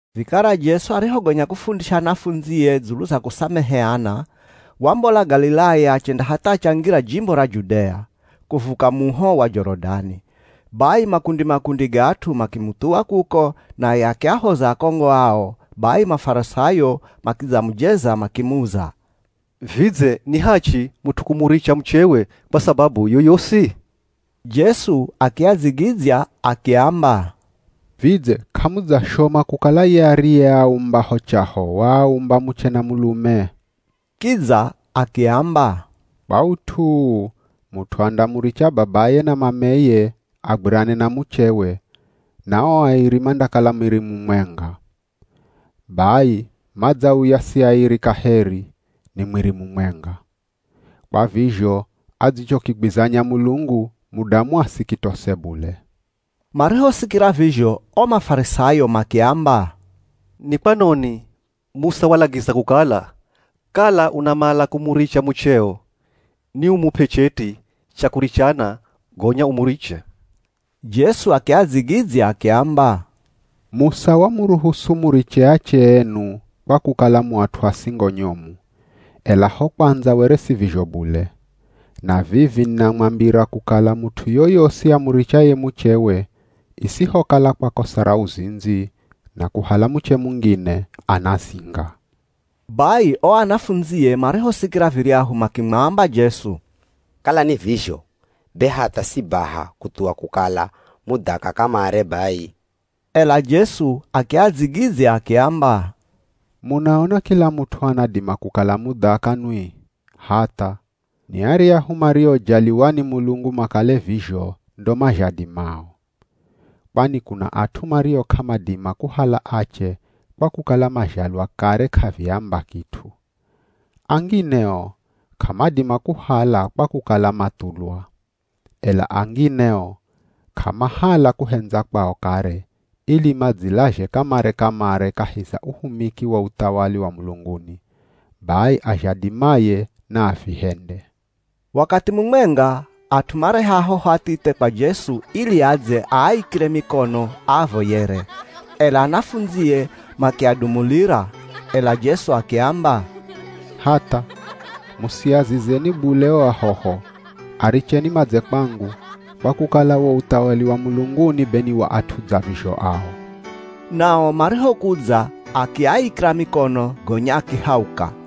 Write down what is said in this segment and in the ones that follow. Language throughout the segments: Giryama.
Vikara Jesu arihogonya kufundisha anafundzie dzulu za kusameheana, wambola Galilaya achenda hatha achangira jimbo ra Judea, kuvuka muho wa Jorodani. Bai makundi-makundi ga at'u makimuthuwa kuko, naye akiahoza akongo ao. Bai Mafarisayo makidzamujeza makimuza, “Vidze ni hachi mut'u kumuricha muchewe kwa sababu yoyosi?” Jesu akiadzigidzya akiamba, “Vidze k'amudzashoma kukala ye ariyeaumba ho chaho waaumba muche na mulume. Kidza akiamba, ‘Kwa ut'u uu mut'u andamuricha babaye na mameye agwirane na muchewe, na ao airi mandakala mwiri mumwenga.’ Bai, madzauya si airi kaheri, ni mwiri mumwenga. Kwa vizho adzichokigwizanya Mulungu, mudamu asikitose bule.” Marihosikira vizho o Mafarisayo makiamba, “Ni kwanoni Musa walagiza kukala, kala unamala kumuricha mucheo niumup'e cheti cha kurichana gonya umuriche?” Jesu akiadzigidzya akiamba, “Musa wamuruhusu muriche ache enu kwa kukala mu at'u a singo nyomu, ela ho kwandza were si vizho bule. Na vivi ninamwambira kukala mut'u yoyosi amurichaye muchewe, isihokala kwa kosa ra uzindzi, na kuhala muche mungine, anazinga.” Bai o anafundzie marihosikira viryahu makimwamba Jesu, “Kala ni vizho be hatha si baha kuthuwa kukala mudhaka kamare bai.” Ela Jesu akiadzigidzya akiamba, “Munaona kila mut'u anadima kukala mudhaka nwi? Hatha, ni aryahu mariojaliwa ni Mulungu makale vizho ndo mazhadimao. Kwani kuna at'u mario k'amadima kuhala ache kwa kukala mazhalwa kare k'aviamba kit'u. Angine o k'amadima kuhala kwa kukala mathulwa. Ela angine o, k'amahala kuhendza kwao kare, ili madzilazhe kamare-kamare kahi za uhumiki wa uthawali wa mulunguni. Bai azhadimaye naavihende.” Wakathi mumwenga, at'u mareha ahoho athithe kwa Jesu ili adze aaikire mikono aavoyere, ela anafundzie makiadumulira. Ela Jesu akiamba, “Hatha, musiazizeni bule o ahoho, aricheni madze kwangu, kwa kukala wo uthawali wa mulunguni be ni wa at'u dza vizho ao.” Nao marihokudza akiaikira mikono gonya akihauka.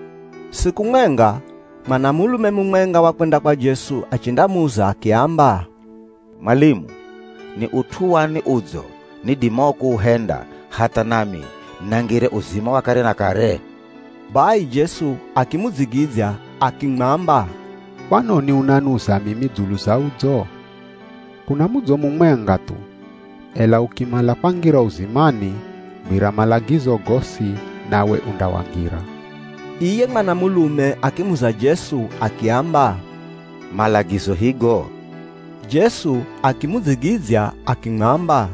Siku mwenga, mwanamulume mumwenga wakwenda kwa Jesu achendamuza akiamba, “Mwalimu, ni ut'u wani udzo nidimao kuuhenda hatha nami nangire uzima wa kare na kare?” Bai Jesu akimudzigidzya akimwamba, “Kwanoni unanuza mimi dzulu za udzo? Kuna mudzo mumwenga thu, ela ukimala kwangira uzimani, gwira malagizo gosi nawe undawangira.” Iye mwanamulume akimuza Jesu akiamba, “Malagizo higo?” Jesu akimudzigidzya akimwamba,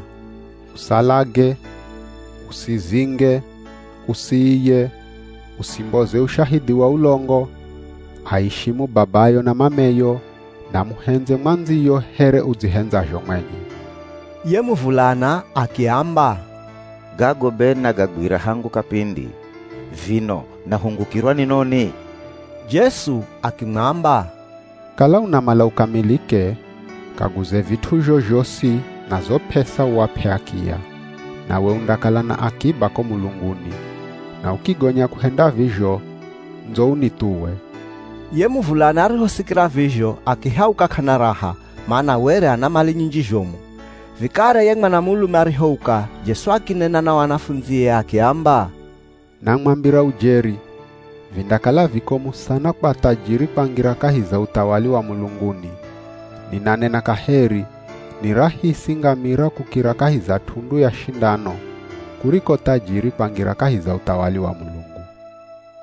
“Usalage, usizinge, usiiye, usimboze ushahidhi wa ulongo, aishimu babayo na mameyo, na muhendze mwandziyo here udzihendzazho mwenye.” Ye muvulana akiamba, “Gago be nagagwira hangu kapindi. Vino nahungukirwa ni noni?” Jesu akimwamba, “Kala unamala ukamilike, kaguze vit'uzho zhosi na zo p'esa uap'e akiya. Nawe undakala na akiba ko mulunguni. Na ukigonya kuhenda vizho, ndzo unithuwe.” Ye muvulana arihosikira vizho akihauka k'ana raha, mana were ana mali nyinji zhomu. Vikara ye mwanamulume arihouka, Jesu akinena na o anafundzie akiamba, “Namwambira ujeri, vindakala vikomu sana kwa thajiri kwangira kahi za uthawali wa mulunguni. Ninanena kaheri, ni rahisi ngamira kukira kahi za t'undu ya shindano kuriko thajiri kwangira kahi za uthawali wa Mulungu.”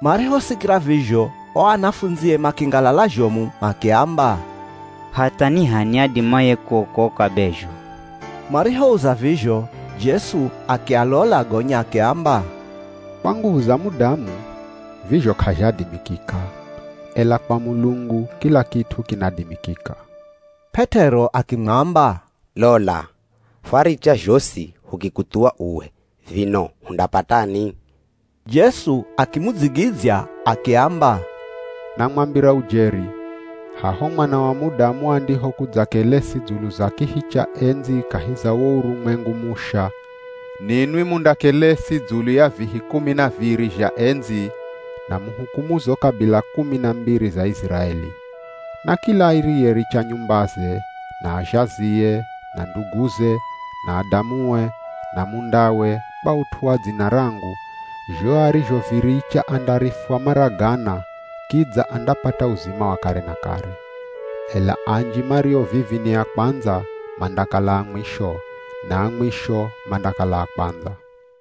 Marihosikira vizho, o anafundzie makingalala zhomu makiamba, “Hatha ni h'ani adimaye kuokoka be zho?” Marihouza vizho, Jesu akialola gonya akiamba, “Kwa nguvu za mudamu, vizho k'azhadimikika, ela kwa Mulungu, kila kit'u kinadimikika.” P'et'ero akimwamba, “Lola, fwaricha zhosi hukikuthuwa uwe, vino hundapatani?” Jesu akimudzigidzya akiamba, “Namwambira ujeri, haho Mwana wa Mudamu andihokudza kelesi dzulu za kihi cha endzi kahi za wo urumwengu musha, ninwi mundakelesi dzulu ya vihi kumi na viri zha endzi na muhukumu zo kabila kumi na mbiri za Iziraeli. Na kila ariyericha nyumbaze, na azhazie, na nduguze, na adamue, na mundawe, kwa ut'u wa dzina rangu, zho arizhoviricha andarifwa mara gana, kidza andapata uzima wa kare na kare. Ela anji mario vivi ni a kwandza, mandakala a mwisho, na a mwisho, mandakala a kwandza.”